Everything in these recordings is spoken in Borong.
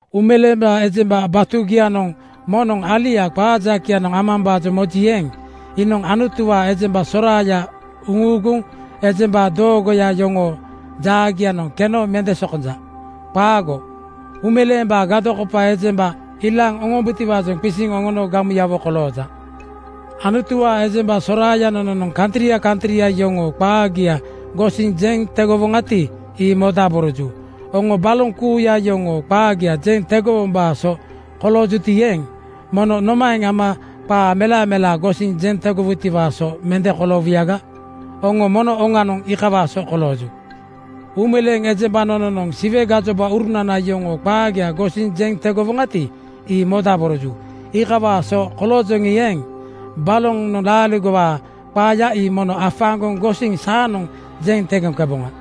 Uumeleeŋ ejemba batugianoŋ moŋnoŋ alia qaa jakeyanoŋ amambaajoŋ moji eeŋ, iinoŋ Anutuwaa ejemba soraaya uŋuuguŋ ejemba doogoya yoŋoo jaagianoŋ keno mende sokonja. Qaago! Uumeleembaa gadokopa ejemba ilaaŋ mubutiwaajoŋ qisiŋ oŋono gamuyawo kolooja. Anutuwaa ejemba soraaya nononoŋ kantria kantria yoŋoo qaagia gosiŋ jeŋ tegowoŋati, ii modaboroju. Oŋo baloŋ kuuya yoŋoo qaagia jeŋ tegowombaa so koloojuti eeŋ, mono nomaeŋ ama qaa melamelaa gosiŋ jeŋ tegowutiwaa so mende koloowuyaga? Oŋo mono oŋanoŋ iikawaa so kolooju. Uumeleeŋ ejemba nononoŋ Siwe gajobaurunana yoŋoo qaagia gosiŋ jeŋ tegowoŋati, ii modaboroju. Iikawaa so koloojoŋi eeŋ, balonoŋ laaligowaa qaaya ii mono afaaŋgoŋ gosiŋ saanoŋ jeŋ tegoŋkeboŋa.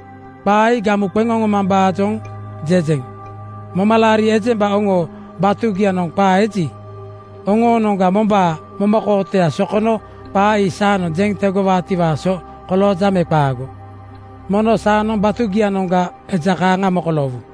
Qaa ii gamu qeŋ oŋomambaajoŋ jejeŋ. Momalaari ejemba oŋoo batugianoŋ qaa eji, oŋoonoŋga mombaa momakootoya sokono qaa ii saanoŋ jeŋ tegowaatiwaa so kolooja me qaago? Mono saanoŋ batugianoŋga eja kaaŋa mokoloowu.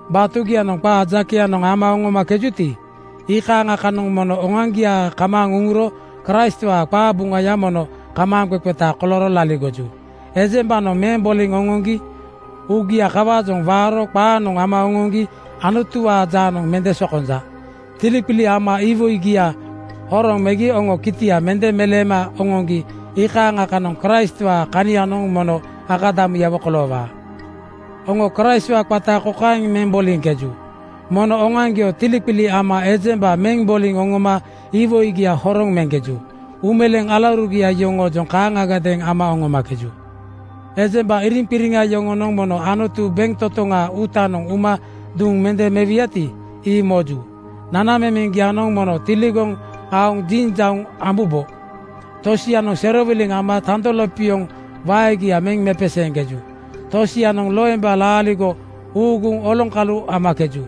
Batugianoŋ qaa jakeyanoŋ ama aoŋkejuti, iikaaŋa kanoŋ mono oŋoaŋgia kamaaŋ uŋuro Kraistwaa qabuŋayanoŋ mono kamaaŋqeqeta kolooro laligoju. Ejembanoŋ meŋ boliŋ oŋoŋgi uugia kawaajoŋ waaro qaanoŋ ama oŋoŋgi Anutuwaa jaanoŋ mende sokonja. Tiliqili ama iwoigia horoŋ megi oŋo kitia mende meleema oŋoŋgi iikaaŋa kanoŋ Kraistwaa kanianoŋ mono akadamuyawo koloowaa. Oŋo Kraistwaa qata kokaeŋ meŋ boliŋkeju: Mono oŋoaŋgio tiliqili ama ejemba meŋ boliŋ oŋoma iwoigia horoŋ meŋkeju. Uumeleeŋ alaurugia yoŋoojoŋ kaaŋagadeeŋ ama oŋomakeju. Ejemba iriŋqiriŋa yoŋonoŋ mono Anutu bentotoŋaa uutanoŋ uma duŋ mende mewuyati, ii moju. Nanamemeŋgianoŋ mono tiligoŋ aoŋ jinjauŋ ambubo. Tosianoŋ serowiliŋ ama tando lopioŋ waegia meŋ mepeseeŋkeju. Tosianoŋ loemba laaligo uuguŋ oloŋkalu amakeju.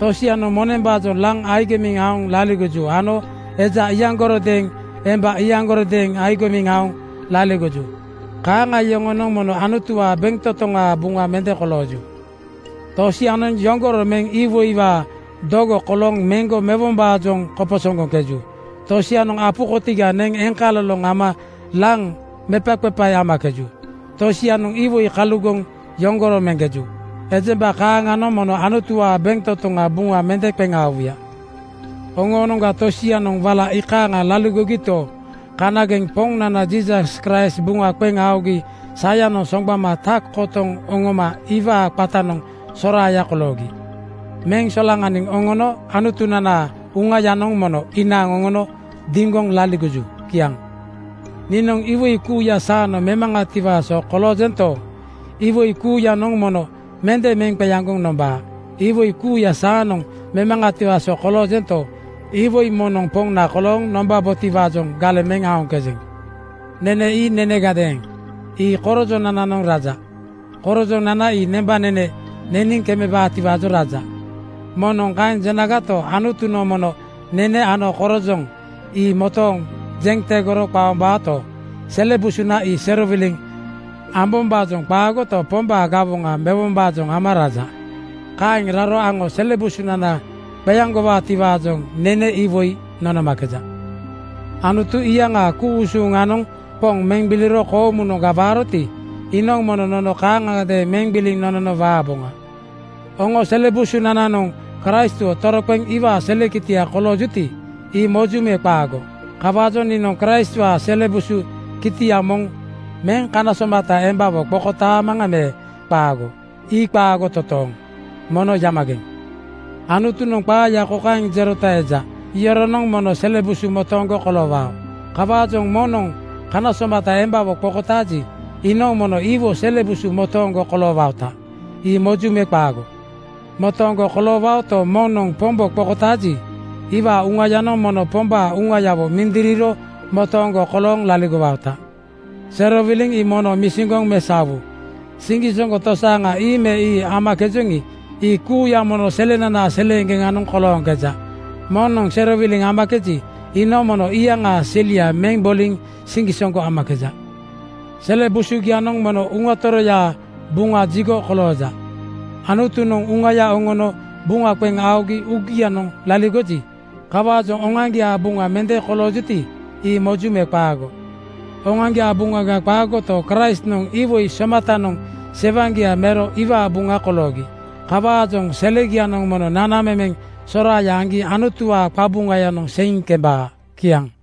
Tosianoŋ monembaajoŋ laŋ agimiŋ aoŋ laligoju ano eja iyaŋgarodeeŋ emba iyaŋgarodeeŋ agimiŋ aoŋ laligoju. Kaaŋa yoŋonoŋ mono Anutuwaa bentotoŋaa buŋa mende kolooju. Tosianoŋ yoŋgoro meŋ iwoiwaa dogo kolooŋ meŋgo mewombaajoŋ koposoŋgoŋkeju. Tosianoŋ apu kotiga neŋ eŋkaloloŋ ama laŋ mepaqepae amakeju. Tosianoŋ iwoi kalugoŋ yoŋgoro meŋkeju. Ejemba kaaŋanoŋ mono Anutuwaa bentotoŋa buŋa mende qeŋ aowuya. Oŋoonoŋga tosianoŋ wala iikaaŋa laligogito, kanageŋ Poŋnana Jiisas Kraist buŋa qeŋ aogi sayanoŋ soŋgbama tak kotoŋ oŋoma iwaa qatanoŋ soraaya koloogi. Meŋ solaŋaniŋ oŋono Anutunanaa Uŋayanoŋ mono inaaŋ oŋono diŋgoŋ laligoju. Kiaŋ. Niinoŋ iwoi kuuya saanoŋ memaŋatiwaa so koloojento, iwoi kuuyanoŋ mono mende meŋ qeaŋgoŋ nombaa. Iwoi kuuya saanoŋ memaŋatiwaa so koloojento, iwoi moŋnoŋ poŋna kolooŋ nombabotiwaajoŋ galeŋ meŋ aoŋkejeŋ. “Nene ii nenegadeeŋ. Ii korojonanaajoŋ raja. Korojonana ii nembanene neniŋ kemebaatiwaajoŋ raja.” Moŋnoŋ kaeŋ jenagato, Anutunoŋ mono nene ano korojoŋ ii motooŋ jeŋ tegoro qaombaota. Sele busunana ii serowiliŋ ambombaajoŋ qaagoto, Pombaa gawoŋa mewombaajoŋ ama raja. Kaeŋ raro aŋo sele busunana qeaŋgowaatiwaajoŋ nene iwoi nonomakeja. Anutu iyaŋaa ku-usuŋanoŋ Poŋ meŋ gbiliro koomunoŋga waaroti, iinoŋ mono nono kaaŋagadeeŋ meŋ gbiliŋ nonono waaboŋa. Oŋoo sele busugianoŋ Kraistwo toroqeŋ iwaa sele kitia koloojuti, ii moju me qaago? Kawaajoŋ niinoŋ Kraistwaa sele busu kitia moŋ meŋ kana somata embawo qokotaamaŋa me qaago? Ii qaago totooŋ! Mono yamageŋ! Anutunoŋ qaaya kokaeŋ jerota eja, “Yoronoŋ mono sele busu motooŋgo koloowao.” Kawaajoŋ moŋnoŋ kana somata embawo qokotaaji, iinoŋ mono iwo sele busu motooŋgo koloowaota. Ii moju me qaago? Motooŋgo koloowaoto, moŋnoŋ Pombo qokotaaji, iwaa uŋayanoŋ mono Pombaa Uŋayawo mindiriro motooŋgo kolooŋ laligowaota. Serowiliŋ ii mono misiŋgoŋ mesaowu. Siŋgisoŋgo tosaaŋa ii me ii amakejoŋi, ii kuuya mono selenanaa seleeŋgeŋanoŋ kolooŋkeja. Moŋnoŋ serowiliŋ amakeji, iinoŋ mono iyaŋaa selia meŋ boliŋ siŋgisoŋgo amakeja. Sele busugianoŋ mono Uŋa Toroyaa Buŋa jigoya (tempel) kolooja. Anutunoŋ Uŋaya oŋono buŋa qeŋ aogi uugianoŋ laligoja. Kawaajoŋ oŋoaŋgiaa buŋa mende koloojuti, ii moju me qaago? Oŋoaŋgiaa buŋaga qaagoto, Kraistnoŋ iwoi somatanoŋ sewaŋgia mero iwaa buŋa koloogi. Kawaajoŋ selegianoŋ mono nanamemeŋ soraaya aŋgi Anutuwaa qabuŋayanoŋ seiŋ kembaa. Kiaŋ.